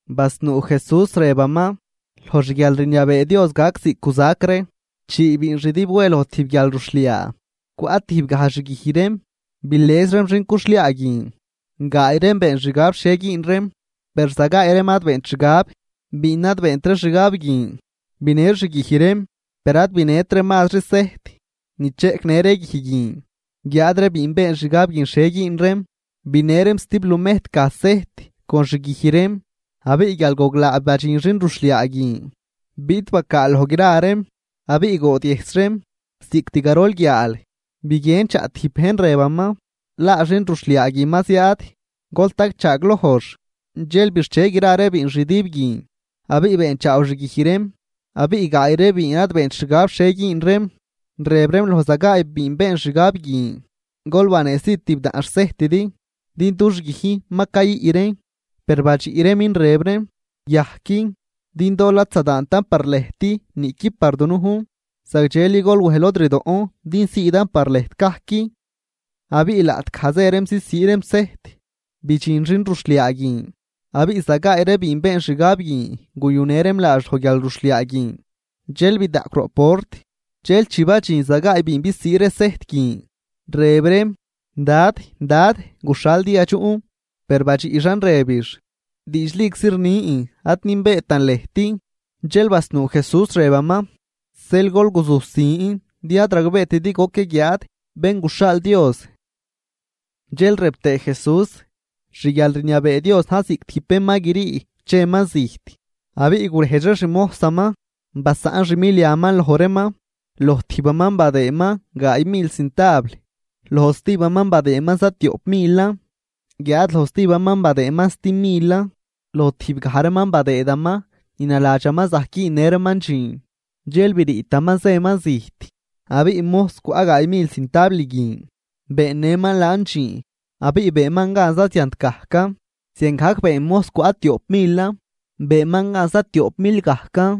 Basnuu Jesús rëbaman: ―Loj xguialrniabee Dios gac ziꞌc guzac ree chii biinxdüb we loj tijb guialruxhliaa cwaꞌ tijbgaj xguij reem bilëz reem xin cuxhliaa guin. Gaay reem been xgab xhie güün reem, per za gaay reem ad beent xgab. Biin ad beent ree xgab guin binë xguij reem per ad binët reem mazri sejt ni cheꞌcnë ree guij guin. Guiáad ree biin been xgab guin xhie güün reem, binë reem za tib lumejtgaj sejt con xguij reem. Abiꞌ guial goglaa badxin xinruxhliaa guin, biꞌt bacaal loj gra reem, abiꞌ goodyëjs reem. Cost garol guiaal, biguien chaꞌ tijb bejn rëbaman: “¡Laa xinruxhliaa guin ma ziaad, gol tagchaaglojx!” Dxel bixche gra ree biinxdüb guin, abiꞌ beenchaaw xguij reem. Abiꞌ gaay ree biin ad beent xgab guin xhie güün reem, rëb reem loj za gaay biin been xgab guin: “Gol baneesii tibdaꞌn xsejtidi, din dux guijn ma cayüꞌ reen.” Per badxiꞌ reemin rëb reem: “Yajqui, din dool ad zadaantan par lëjt niꞌqui par dunujn. Zagdxeli gol wëj lod rdoꞌn din siidan par lëjt gajc.” Abiꞌ laꞌtgaj zë reem zisii reem sejt, bidxin xinruxhliaa guin, abiꞌ za gaay ree biin been xgab guin guyunë reem laax loj guialruxhliaa guin dxel bidaꞌcw roꞌ port. Dxel chi badxin za gaay biin bisii ree sejt guin, rëb reem: “¡Dad, dad, guxhal din yadxuꞌn!” Per badxiꞌxan rëbix: “Diidxliczi rnin, ad nünbeetan lëjt.” Dxel basnuu Jesús rëbaman: ―Zeel gol guzusin din ad ragbeetidi goc yaguiaad Bén guxhaal Dios. Dxel rëb tëë Jesús: ―Xguialrniabee Dios na̱j ziꞌc tijb bén ma grii cheman zijt, abiꞌ gurejdx ree xmojsaman, basaꞌn xmiliaman loj reeman. ’Loj tijbaman badëëman gaay mil cintabl, loj zatijbaman badëëman zatioꞌp milan, guiáad loj zatijbaman badëëman za timilan. Loj tijbgaj reeman badëëdaman ni naladxaman zajc güünnë reeman dxiin, dxel briitaman zëman zijt. Abiꞌ mojs cwaꞌ gaay mil cintabl guin beennëman laan dxiin abiꞌ beenman gan za ziant gajcan. Ziangajc been mojs cwaꞌ tioꞌp milan, beenman gan za tioꞌp mil gajcan.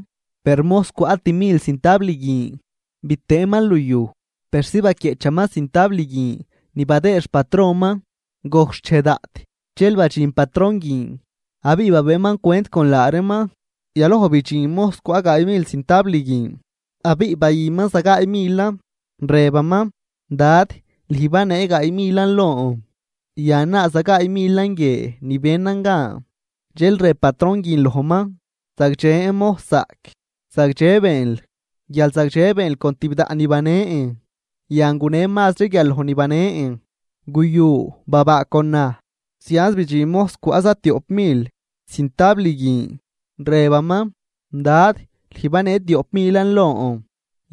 Per mojs cwaꞌ timil cintabl guin bitëënman luyuj persi baquieꞌchaman cintabl guin ni badëëd xpatronman. ’Gojc xchej daꞌt dxel badxin patron guin abiꞌ babëëman cwent con la reeman. Yaloj bidxin mojs cwaꞌ gaay mil cintabl guin abiꞌ bayüman zagaay milan, rëbaman: “Dad, lüj banee gaay milan lon, yan, laa za gaay milan guie ni benan gan.” Dxel rëb patron guin lojman: “Zagdxen, mojszaꞌc, zagdxe beenl, guial zagdxe beenl con tibdaꞌn ni banen, yan, gunen mazri guial loj ni banen. Guyu, babaa con naj.” Zianz bidxin mojs cwaꞌ zatioꞌp mil cintabl guin rëbaman: “Dad, lüj banee tioꞌp milan lon,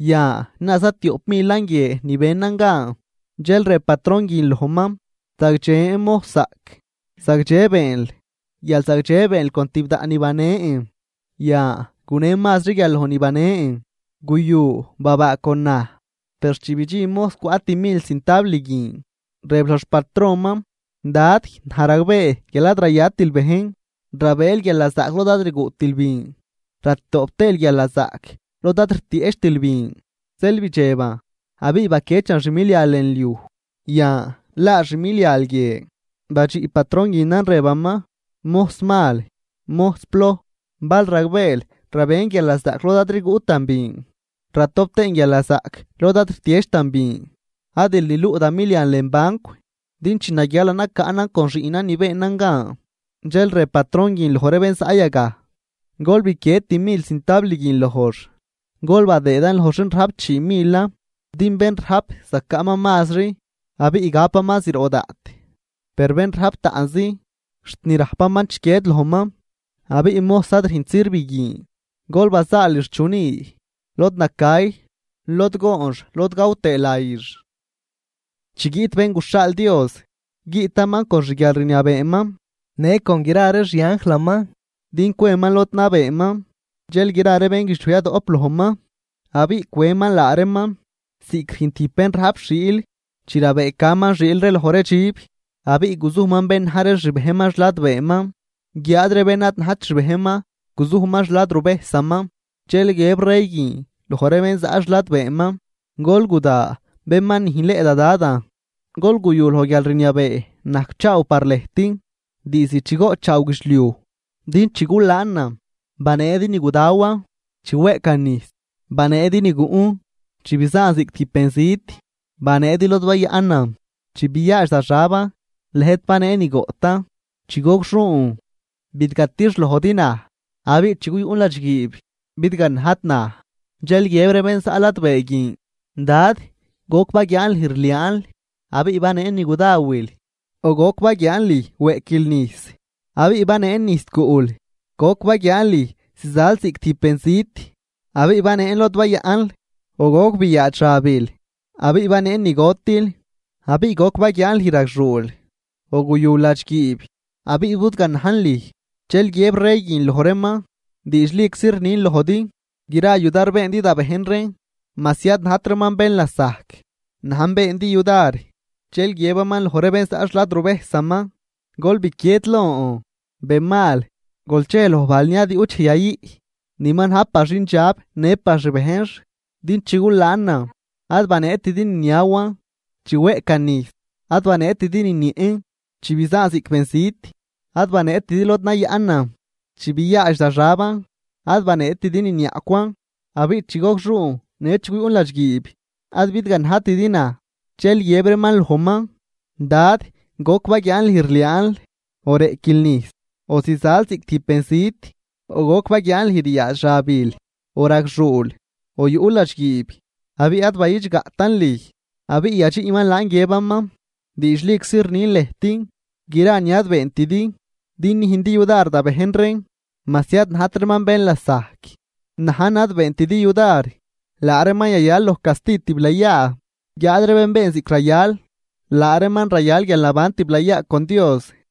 yan, laa zatioꞌp milan guie ni benan gan.” Dxel rëb patron guin lojman: “Zagdxen, mojszaꞌc, zagdxe beenl, guial zagdxe beenl con tibdaꞌn ni banen, yan, gunen mazri guial loj ni banen. Guyu, babaa con naj.” ’Per chi bidxin mojs cwaꞌ timil cintabl guin, rëb loj xpatronman: “Dad, naj ragbee guial ad rayatil bejn, rabëël guialnazaꞌc lod ad rguꞌtil bin, ratoꞌp tëël guialnazaꞌc lod ad rtieꞌchtil bin. Zeel bidxeban abiꞌ biquiechan xmilial lën liuj, yan, laa xmilial guie.” Badxiꞌ patron guinan, rëbaman: “Mojs mal, mojs ploj, bal ragbeel rabën guialnazaꞌc lod ad rguꞌtan bin, ratop tëën guialnazaꞌc lod ad rtiechtan bin. Adil niluꞌ da milian lën bancw, din chi naguialan nacaꞌnan con xiꞌnan ni beenan gan.” Dxel rëb patron guin loj ree bén zaꞌ yagaj: “Gol biquied timil cintabl guin lojx, gol badëëdan loj xin rajp chii milan. Din bén rajp zacaꞌman mazri, abiꞌ gapaman zroꞌ daꞌt, per bén rajp taꞌnzi, xt ni rajpaman chiquied lojman. Abiꞌ mojs ad rünjt sirv guin gol bazaalix xchuni lod nacay, lod goonx, lod gaw tëë layix.” ’Chi guiꞌt Bén guxhaal Dios, guiꞌtaman con xguialrniabeeman, në con gra ree xianjlaman din cweman lod nabeeman. Dxel gra ree bénguidxliuj yadoꞌp lojman, abiꞌ cweman laa reeman ziꞌc rüjn tijb bén rajp xiil chi rabëëcaman xiil ree loj ree dxib. Abiꞌ guzujman bén na̱j ree xbejnman xladbeeman, guiáad ree bén ad najt xbejnman guzujman xladruvejsaman. Dxel guiëb rey guin loj ree bén zaꞌ xladbeeman: “Gol guda bén ma nüjnleꞌ da Dadan. Gol guyu loj guialrniabee najcchaaw par lëjt, diizd chi goꞌtchaaw guidxliuj. Din chi gulaanan, baneedi ni gudawan, chi weꞌcan nijs, baneedi ni guꞌn, chi bizaan ziꞌc tijb benzit, baneedi lod bayaꞌnan. Chi byaadx da xaban, lëjt banee ni goꞌtan, chi gogxuun, bidgatixlojdi naj, abiꞌ chi guyuꞌn ladxguiib, bidganajdi naj.” Dxel guiëb ree bén zaꞌ ladbee guin: “Dad, ¿goc baguiaan lüj rliaanl, abiꞌ baneen ni gudawil?, ¿o goc baguiaan lüj weꞌquil nijs, abiꞌ baneen nijs guꞌl? ¿Goc baguiaan lüj zizal ziꞌc tijb benzit, abiꞌ baneen lod bayaꞌnl, o goc biyaadx xabil, abiꞌ baneen ni gotil? ¿Abiꞌ goc baguiaan lüj ragxuul, o guyul ladxguiib, abiꞌ budganajn lüj?” Dxel guiëb rey guin loj reeman: “Diidxliczi rnin lojdi, gra yudar beendi da bejn reen majsi ad najt reeman bén lasajc, najn beendi yudar.” ’Dxel guiëbaman loj ree bén zaꞌ xladruvejsaman: “Gol biquied lon, benmal gol chej loj bajl ni ad yuꞌt dxej yayüꞌ ni ma na̱j par xindxab në ree xbejnx. Din chi gulaanan, ad baneetidi ni niawan, chi weꞌcan nijs, ad baneetidi ni niëꞌn. Chi bizaan ziꞌc benzit, ad baneetidi lod nayaꞌnan, chi biyaadx da xaban, ad baneetidi ni niaꞌcwan. Abiꞌ chi gogxuun në chi guyuꞌn ladxguiib, ad bidganajtidi naj.” Dxel guiëb reeman lojman: “Dad, ¿goc baguiaan lüj rliaanl o reꞌquil nijs, o zizal ziꞌc tijb benzit, o goc baguiaan lüj ryaadx xabil, o ragxuul, o yuꞌl ladxguiib, abiꞌ ad bayidxgaꞌtan lüj?” Abiꞌ yadxiꞌman laan guiëbaman: “Diidxliczi rnin lëjt, gra ni ad beentidi din nüjndi yudar da bejn reen majsi ad najt reeman bén lasajc, najn ad beentidi yudar.” Laa reeman yayal loj casti tiblayaa, guiáad ree bén been ziꞌc rayal, laa reeman rayal guialnaban tiblayaa con Dios.